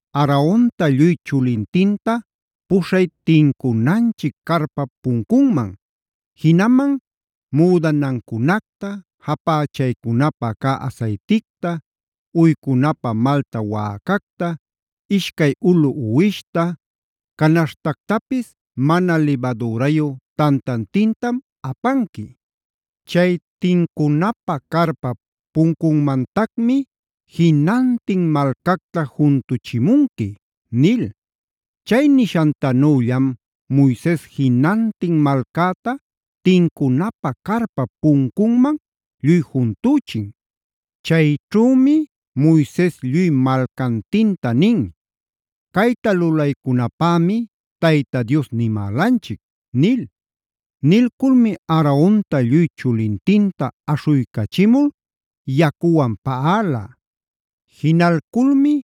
“Aaronta lluy chulintinta puśhay tincunanchic carpap puncunman. Jinaman müdanancunacta, japächaycunapä cä asayticta, uycunapä malta wäcacta, ishcay ulu uwishta, canaśhtactapis mana libadürayu tantantintam apanqui. Chay tincunapä carpap puncunmactacmi jinantin malcacta juntuchimunqui” nil. Chay nishantanüllam Moises jinantin malcäta tincunapä carpap puncunman lluy juntüchin. Chayćhümi Moises lluy malcantinta nin: “Cayta lulaycunapämi Tayta Dios nimälanchic” nil. Nilculmi Aaronta lluy chulintinta aśhuycachimul yacuwan paꞌala. Jinalculmi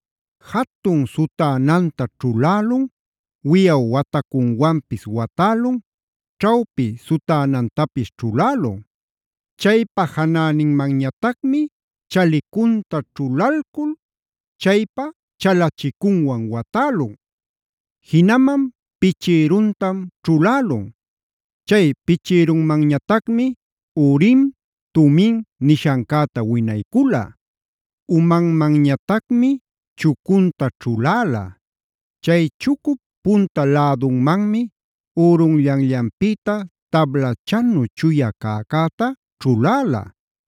jatun sutänanta ćhulälun, wiyaw watacunwanpis watälun, ćhawpi sutänantapis ćhulälun. Chaypa janäninmanñatacmi chalicunta ćhulalcul chaypa chalachicunwan watälun. Jinaman pichïruntam ćhulälun; chay pichïrunmanñatacmi Urim, Tumim nishancäta winaycula. Umanmanñatacmi chucunta ćhuläla. Chay chucup punta lädunmanmi ürunllanllanpïta tablachanu chuya cäcäta ćhuläla.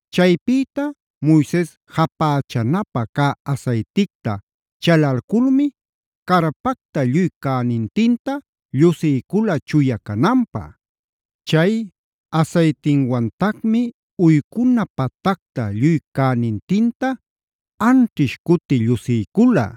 Chaypïta Moises japächanapä cä asayticta chalalculmi carpacta lluy cänintinta llusiycula chuya cananpä. Chay asaytiwantacmi uycuna patacta lluy cänintinta anćhish cuti llusiycula.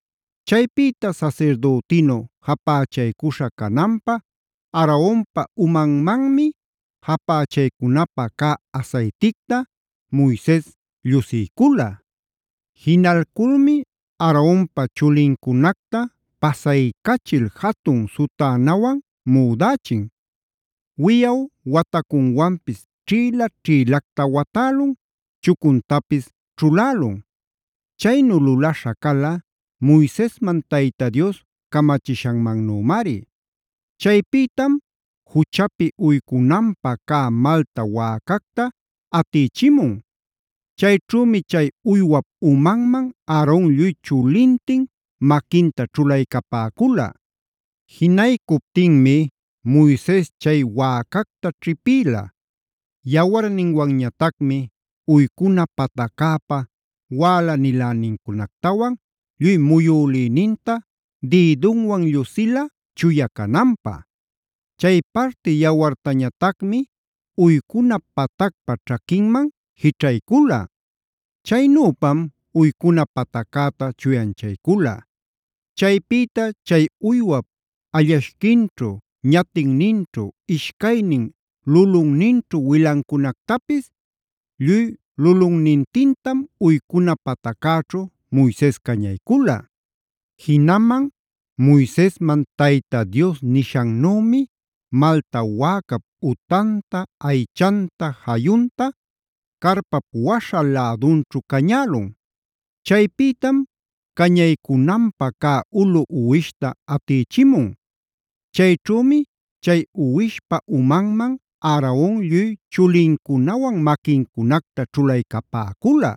Chaypïta sasirdütinu japächaycuśha cananpä Aaronpa umanmanmi japächaycunapä cä asayticta Moises llusiycula. Jinalculmi Aaronpa chulincunacta pasaycachil jatun sutänawan müdächin. Wiyaw watacunwanpis ćhïla-ćhïlacta watälun, chucuntapis ćhulälun. Chaynu lulaśha cala Moisesman Tayta Dios camachishanmannümari. Chaypïtam juchapi uycunanpä cä malta wäcacta atïchimun. Chayćhümi chay uywap umanman Aaron lluy chulintin maquinta ćhulaycapäcula. Jinaycuptinmi Moises chay wäcacta ćhipïla. Yawarninwanñatacmi uycuna pataccäpa wälanilänincunactawan lluy muyülïninta dïdunwan llusila chuya cananpä. Chay parti yawartañatacmi uycuna patacpa ćhaquinman jićhaycula. Chaynüpam uycuna pataccäta chuyanchaycula. Chaypïta chay uywap allashquinćhu, ñatinninćhu, ishcaynin lulunninćhu wilancunactapis lluy lulunnintintam uycuna pataccäćhu Moises cañaycula. Jinaman Moisesman Tayta Dios nishannümi malta wäcap utanta, aychanta, jayunta carpap waśha lädunćhu cañälun. Chaypïtam cañaycunanpä cä ulu uwishta atïchimun. Chayćhümi chay uwishpa umanman Aaron lluy chulincunawan maquincunacta ćhulaycapäcula.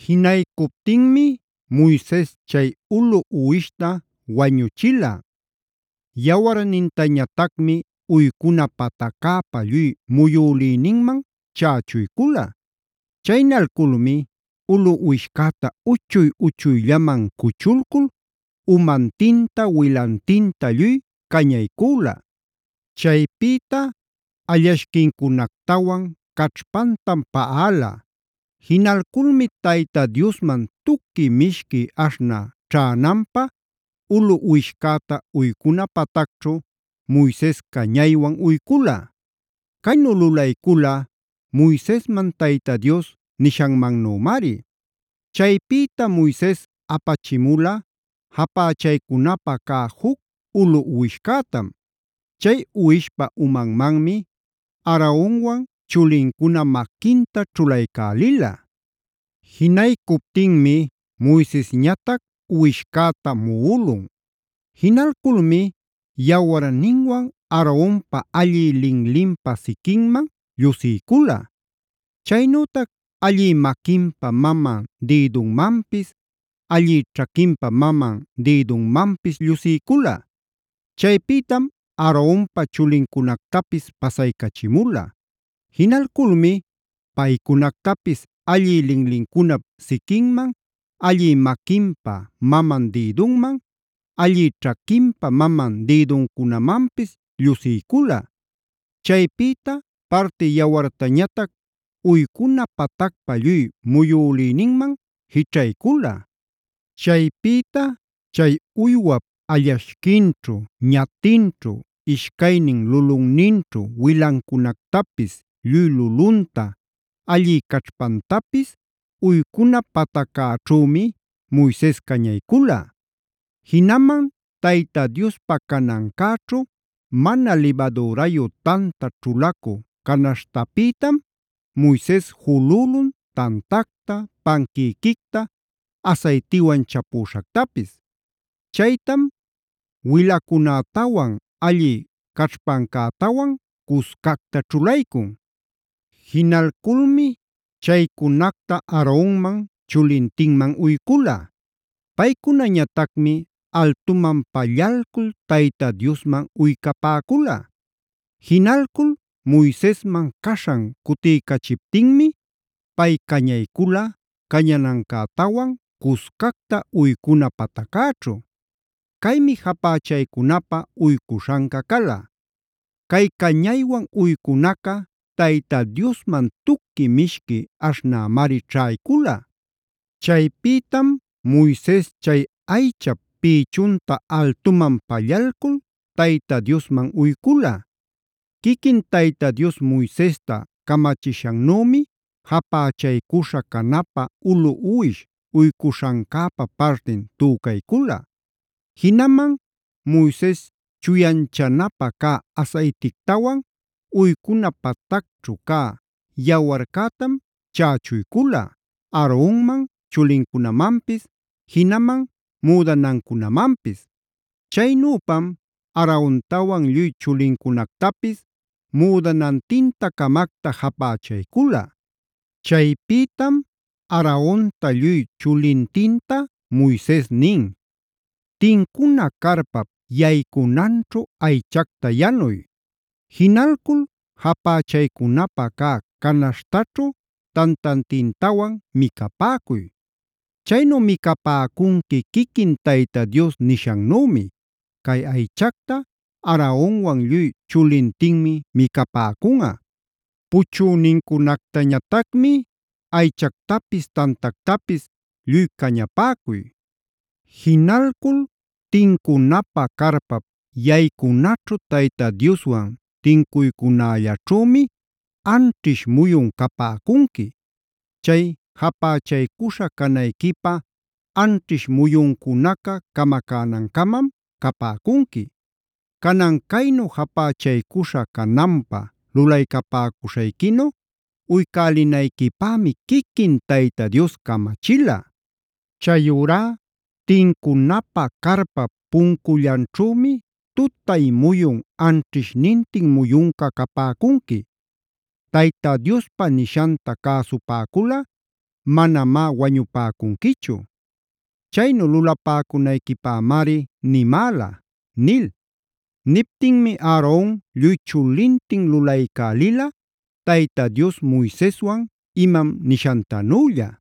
Jinaycuptinmi Moises chay ulu uwishta wañuchila. Yawarnintañatacmi uycuna pataccäpa lluy muyülïninman chächuycula. Chaynalculmi ulu uwishcäta uchuy-uchuyllaman cuchulcul umantinta, wilantinta lluy cañaycüla. Chaypïta allashquincunactawan caćhpantam paꞌala. Jinalculmi Tayta Diosman tuqui mishqui aśhnä ćhänanpä ulu uwishcäta uycuna patacćhu Moises cañaywan uycula. Caynu lulaycula Moisesman Tayta Dios nishanmannümari. Chaypïta Moises apachimula japächaycunapä cä juc ulu uwishcätam. Chay uwishpa umanmanmi Aaronwan chulincuna maquinta ćhulaycälila. Jinaycuptinmi Moisesñatac uwishcäta muꞌulun. Jinalculmi yawarninwan Aaronpa allï linlinpa siquinman llusiycula; chaynütac allï maquinpa maman dïdunmanpis, allï ćhaquinpa maman dïdunmanpis llusiycula. Chaypïtam Aaronpa chulincunactapis pasaycachimula. Jinalculmi paycunactapis allï linlincunap siquinman, allï maquinpa maman dïdunman, allï ćhaquinpa maman dïduncunamanpis llusiycula. Chaypïta parti yawartañatac uycuna patacpa lluy muyülïninman jićhaycula. Chaypïta chay uywap allashquinćhu, ñatinćhu, ishcaynin lulunninćhu wilancunactapis lluy lulunta, allï caćhpantapis uycuna pataccäćhümi Moises cañaycula. Jinaman Tayta Diospa canancäćhu mana libadürayu tanta ćhulacu canaśhtapïtam Moises julülun tantacta, panquïquicta asaytiwan chapüśhactapis. Chaytam wilacunätawan allï caćhpancätawan cuscacta ćhulaycun. Jinalculmi chaycunacta Aaronman chulintinman uycula. Paycunañatacmi altuman pallalcul Tayta Diosman uycapäcula. Jinalcul Moisesman caśhan cutiycachiptinmi pay cañaycula cañanancätawan cuscacta uycuna pataccäćhu. Caymi japächaycunapä uycuśhanca cala. Cay cañaywan uycunaca Tayta Diosman tuqui mishqui aśhnämari ćhaycula. Chaypïtam Moises chay aychap pïchunta altuman pallalcul Tayta Diosman uycula. Quiquin Tayta Dios Moisesta camachishannümi japächaycuśha canapä ulu uwish uycuśhancäpa partin tücaycula. Jinaman Moises chuyanchanapä cä asaytictawan uycuna patacćhu cä yawarcätam chächuycula Aaronman chulincunamanpis, jinaman müdanancunamanpis. Chaynüpam Aarontawan lluy chulincunactapis müdanantin-camacta japächaycula. Chaypïtam Aaronta lluy chulintinta Moises nin: “Tincuna carpap yaycunanćhu aychacta yanuy. Jinalcul japächaycunapä cä canaśhtaćhu tantantintawan micapäcuy. Chaynu micapäcunqui quiquin Tayta Dios nishannümi: ‘Cay aychacta Aaronwan lluy chulintinmi micapäcunꞌa. Puchünincunactañatacmi aychactapis tantactapis lluy cañapäcuy. Jinalcul tincunapä carpap yaycunaćhu Tayta Dioswan tincuycunällaćhümi anćhish muyun capäcunqui; chay japächaycuśha canayquipä anćhish muyuncunaca camacänancamam capäcunqui. Canan caynu japächaycuśha cananpäc lulaycapäcuśhayquinu uycälinayquipämi quiquin Tayta Dios camachila. Chayurá tincunapä carpap puncullanćhümi tutay muyun anćhishnintin muyunca capäcunqui. Tayta Diospa nishanta cäsupäculꞌa manamá wañupäcunquichu. Chaynu lulapäcunayquipämari nimäla’” nil. Niptinmi Aaron lluy chulintin lulaycälila Tayta Dios Moiseswan imam nishantanülla.